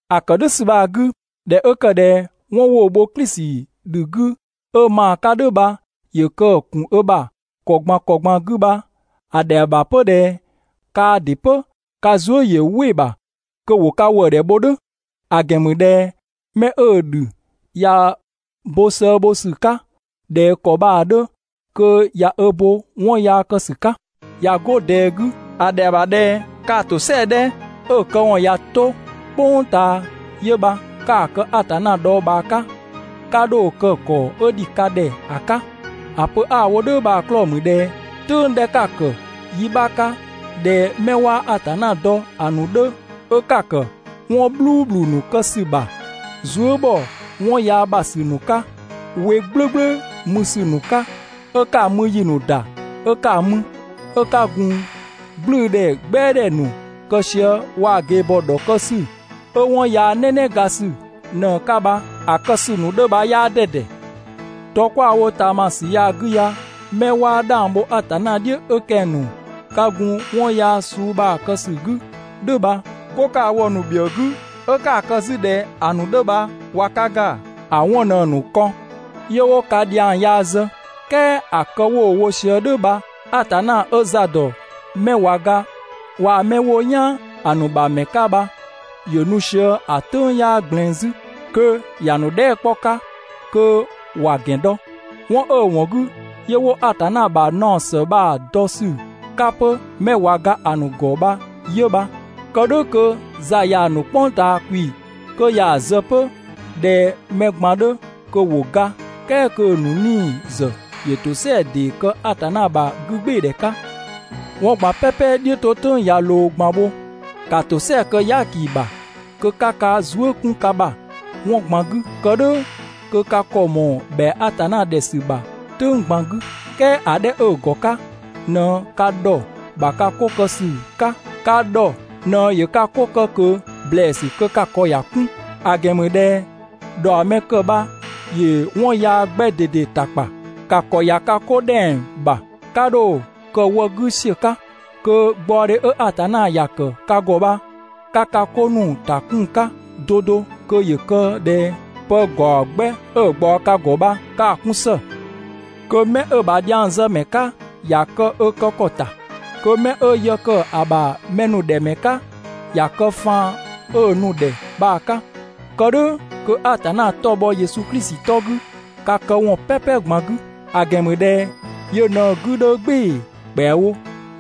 ‑A ‑kë "dhʋ̈ ‑sü bha‑ 'gü, ꞊dhɛ 'ö ‑kë ꞊dhɛ 'wɔn 'wo‑ bho Klisi ‑dhü 'gü 'ö ma‑ 'ka "dhʋ̈ bha ‑yö kë‑ ‑kun ö ‑bha ‑kɔ ꞊gban ‑kɔ ꞊gban 'gü bha, ‑a ‑dhɛa ‑bha 'pö ꞊dhɛ kaa ‑dɩ 'pö ka zuë" ‑yö "wɩ‑ ‑bha kö ‑wo ka ‑wëëdhɛ bho "dhʋ̈. ‑A ‑gɛn ‑mü ꞊dhɛ 'mɛ 'ö‑ ‑dhü ꞊ya bo sëë bho ‑sü 'ka ꞊dhɛ ‑kɔ bha‑ 'dhö kö ꞊ya ö bo 'wɔn yaa kë ‑sü 'ka. ꞊Ya 'go ꞊dɛɛ 'gü, ‑a ‑dhɛa ‑bha ꞊dhɛ kaa‑ ‑tosɛa 'dhɛ 'ö‑ këwɔn ꞊ya 'to "kpʋng ꞊taa yö bha 'ka‑ kë Atanna dhɔɔbhaa 'ka, 'ka 'dho‑ kë ‑kɔ 'ö ‑dhi ka ‑dhɛ ‑a 'ka. ‑A pö 'a‑ wo "dhʋ̈ bha‑ 'klɔɔ‑ ‑mü ꞊dhɛ "tʋ̈ng 'dhɛ 'ka‑ ‑kë yi 'bha 'ka ꞊dhɛ 'mɛ 'waa Atanna dɔ ‑a ‑nu 'dhö 'ö 'ka‑ ‑kë 'wɔn "bhluubhlu ‑nu kë ‑sü ‑bha, zuë" ‑bhɔ 'wɔn yaa ‑bha ‑sü ‑nu 'ka, we "gblʋ̈gblʋ̈ mü ‑sü ‑nu 'ka, 'ö 'ka‑ mü ‑yi ‑nu ‑da 'ö 'ka‑ mü, 'ö 'ka gun "gblʋ̈ʋ̈dhɛ "gbɛadhɛ ‑nu kë sië waa‑ ꞊gebhɔ ‑dhɔkë ‑sü 'ö 'wɔn yaa "nɛnɛga ‑sü ꞊në‑ 'ka bha‑ kë ‑sü ‑nu 'dhö bha 'yaa 'dɛdɛ. Dɔ 'kwa‑ wo ꞊taamasü ya‑ 'gü ya 'mɛ 'waa 'dhang bho Atanna "dhiʋ̈ 'ö kɛng‑ ‑nu 'ka gun‑ 'wɔn yaa suu bha‑ kë ‑sü 'gü "dhʋ̈ bha, 'go 'ka‑ wo‑ ‑nu ‑bhiëë 'gü 'ö 'kaa‑ kë 'zü ꞊dhɛ ‑a ‑nu 'dhö bha ꞊wa ka ‑ga, ‑a 'wɔn ꞊në‑ ‑nu kɔn, 'yö wo ka ‑dhiang yaa zë. "Kɛɛ ‑a kë 'wo‑ wo sië "dhʋ̈ bha Atanna 'ö za ‑dɔ 'mɛ ꞊wa ga waa‑ 'mɛ 'wo "yaan ‑a ‑nu ‑bha ‑mɛ 'ka bha ‑yö nu sië ‑a "tʋ̈ng 'yaa ꞊gblɛɛn 'zü, kö ‑ya ‑nu dhɛɛ" 'kpɔ‑ 'ka kö ‑wa ‑gɛn dɔ. 'Wɔn 'ö‑ ‑wɔn 'gü 'yö 'wo Atanna ‑bha naɔ ‑së bha‑ dɔ ‑sü 'ka 'pö 'mɛ ꞊wa ga ‑a ‑nu ‑gɔ bha 'yö bha, kë "dhʋ̈ kö za ꞊yaa‑ ‑nu "kpʋng ꞊taa ‑kwi kö ya‑ zë 'pö ꞊dhɛ mɛ ꞊gban 'dhö kö ‑wo ga, "kɛɛ kö‑ ‑nu 'nii‑ ‑zë ‑yö ‑tosɛa ‑dee kë Atanna ‑bha 'gügbɩɩdhɛ 'ka. 'Wɔn ꞊gban "pɛpɛ "dhiʋ̈ 'to "tʋ̈ng ꞊ya ꞊loo ꞊gban bho. ‑Ka ‑tosɛa kë "yaaki ‑bha kö 'ka ka zuë" 'kun ka ‑bha 'wɔn ꞊gban 'gü, kë "dhʋ̈ kö ka ‑kɔ ꞊mɔɔ ‑bhɛa Atanna ‑dhɛ ‑sü ‑bha "tʋ̈ng ꞊gban 'gü. "Kɛɛ ‑a 'dhɛ 'ö‑ ‑gɔ 'ka ꞊në ka ‑dhɔ ‑bha ka 'ko kë ‑sü 'ka, ka ‑dhɔ ꞊në ‑yö ka 'ko kë ꞊kö ‑blɛɛsü kö ka ‑kɔ ‑ya 'kun. ‑A ‑gɛn ‑mü ꞊dhɛ ‑dhaɔmɛkë bha ‑yö 'wɔn yaa 'gbɛ ꞊dede ‑ta ‑kpa. ‑Ka ‑kɔ ‑ya ka 'ko ‑dhɛng ‑bha, 'ka 'dho‑ kë wë 'gü ‑siö 'ka, kö gbaɔdhe 'ö Atanna ‑ya ‑kë ka ‑gɔ bha 'ka ka 'ko ‑nu ‑ta 'kun‑ 'ka 'do 'do kö ‑yö kë ꞊dhɛ pë ‑gaɔ 'gbɛ 'ö‑ ꞊gbaɔ ka ‑gɔ bha 'ka‑ 'kun ‑së. Kö 'mɛ 'ö‑ ‑bha dhiangzëmɛ 'ka ‑ya kë ö kë ‑kɔ ‑ta, kö mɛ 'ö yë ‑kë ‑a ‑bha mɛ ‑nu ‑dhɛ ‑mɛ 'ka ‑ya kë faan 'ö‑ nu‑ ‑dhɛ bha‑ 'ka, kë "dhʋ̈ kö Atanna 'tɔ‑ bhɔ Yesu Klisi 'tɔ 'gü ka këwɔn "pɛpɛ ꞊gban 'gü. ‑A ‑gɛn ‑mü ꞊dhɛ yö ꞊në‑ 'gü 'dhö "gbɩɩ‑ ‑kpɛawo,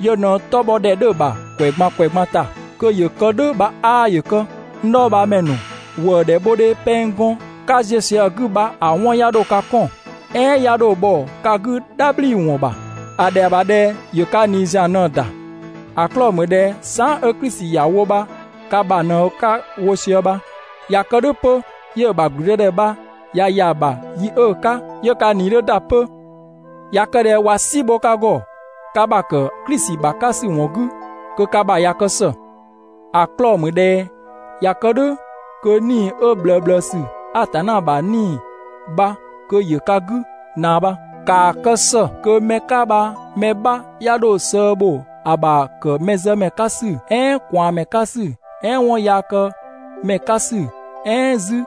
yö ꞊në‑ 'tɔ bhɔ ‑dhɛ 'dhö‑ ‑bha ‑kwɛ ꞊gban ‑kwɛ ꞊gban ‑ta, kö ‑yö kë "dhʋ̈ bha 'aa ‑yö kë. N dhɔɔbhaamɛ ‑nu, ‑wëëdhɛ bhodhe pɛng gɔn 'ka ziö sië‑ 'gü bha‑ 'wɔn 'ya 'dho ka 'kɔn, "ɛɛn 'ya 'dho bhɔ ka 'gü "dhabhliwɔn ‑bha. ‑A ‑dhɛa ‑bha ꞊dhɛ ‑yö ka ꞊nii ‑zian ꞊në‑ ‑da. ‑A 'klɔɔ‑ ‑mü ꞊dhɛ saan" 'ö Klisi ‑ya wo bha ka ‑bha ꞊në 'ka‑ wo sië bha. ꞊Ya kë "dhʋ̈ 'pö 'yö‑ ‑bha ‑gblüdëdhɛ bha ꞊ya ‑ya ‑bha yi 'ö‑ 'ka 'yö ka ꞊nii 'dhö ‑da 'pö. ꞊Ya kë ꞊dhɛ ꞊wa "si bho ka ‑gɔ ka ‑bha ‑kë Klisi ‑bha 'ka ‑sü ‑wɔn 'gü, kö ka ‑bha ꞊ya kë ‑së. ‑A 'klɔɔ‑ ‑mü ꞊dhɛ ꞊ya kë "dhʋ̈ kö 'Nii‑ 'ö ꞊bhlëëbhlëësü, Atanna ‑bha 'Nii‑ bha kö ‑yö ka 'gü ꞊naa bha. ‑Kaa kë ‑së kö 'mɛ 'ka bha mɛ 'bha 'ya 'dho sëë bho ‑a ‑bha ‑kë mɛzëmɛ 'ka ‑sü, "ɛɛn ꞊kwaanmɛ 'ka ‑sü, "ɛɛn 'wɔnyaakëmɛ 'ka ‑sü, "ɛɛn 'zü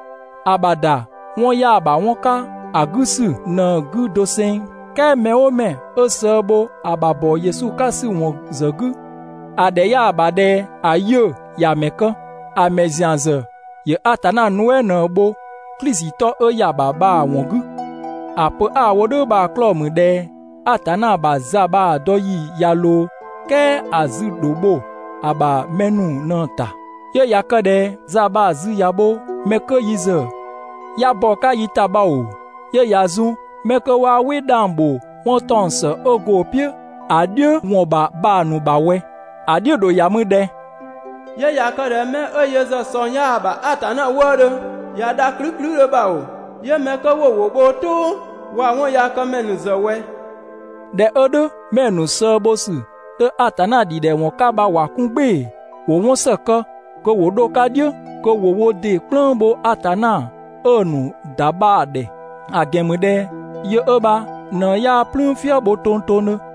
‑a ‑bha ‑da 'wɔn 'yaa‑ ‑bha 'wɔn 'ka ‑a 'gü ‑sü ꞊në‑ 'gü doseng. "Kɛɛ mɛ "ʋʋ mɛ 'ö sëë bho ‑a ‑bha ‑bɔ Yesu 'ka ‑sü ‑wɔn ‑zë 'gü, ‑a ‑dhɛ 'yaa‑ ‑bha ꞊dhɛ ‑a 'yiʋ̈‑ ‑ya ‑mɛ kë. ‑A ‑mɛ ‑zian ‑zë ‑yö Atanna nuɛ" ꞊në‑ bho Klisi 'tɔ 'ö ‑ya ‑bha bha‑ ‑wɔn 'gü. ‑A pö 'a‑ wo "dhʋ̈ bha‑ 'klɔɔ‑ ‑mü ꞊dhɛ Atanna ‑bha za bha‑ dɔ ‑yi ꞊ya ꞊loo, "kɛɛ ‑a zü‑ ‑dho bho ‑a ‑bha mɛ ‑nu ꞊në‑ ‑ta. 'Yö ꞊ya kë ꞊dhɛ za bha‑ zü ꞊ya bho 'mɛ 'kö yi ‑zë 'ya bɔ‑ 'ka yi ‑ta bha ‑oo, 'yö ꞊ya zun 'mɛ 'kö 'waa "wɩ 'dhang bho 'wɔn ‑taɔng ‑së 'ö go‑ "piʋ̈ ‑a "dhiʋ̈ ‑wɔn ‑bha bha‑ ‑nu ‑bha ꞊wɛ? (‑A "dhiʋ̈ ‑dho ‑ya mü ꞊dhɛ?) 'Yö ꞊ya kë ꞊dhɛ 'mɛ 'ö yö ‑zë ꞊sɔng 'yaa‑ ‑bha Atanna wëëdhö ꞊ya dha ‑klüklüdhö bha ‑oo, 'yö 'mɛ 'kö 'wo‑ ‑wʋ bho wo "tʋʋ waa‑ 'wɔnyaakëmɛ ‑nu ‑zë ꞊wɛ? ‑Dhɛ 'ö "dhʋ̈, 'mɛ‑ ‑nu sëë bho ‑sü 'dhö Atanna ‑dhidhɛwɔn 'ka bha ‑wa 'kun "gbɩɩ‑, ‑wo 'wɔn ‑së kë kö ‑wo 'dho‑ 'ka "dhiʋ̈, kö ‑wo wo ‑dɩ "kplëng bho Atanna 'ö‑ ‑nu ‑da bha‑ ‑dhɛ; ‑a ‑gɛn ‑mü ꞊dhɛ yö 'ö bha ꞊në 'yaa "plüün "fië bho tongtongdhö.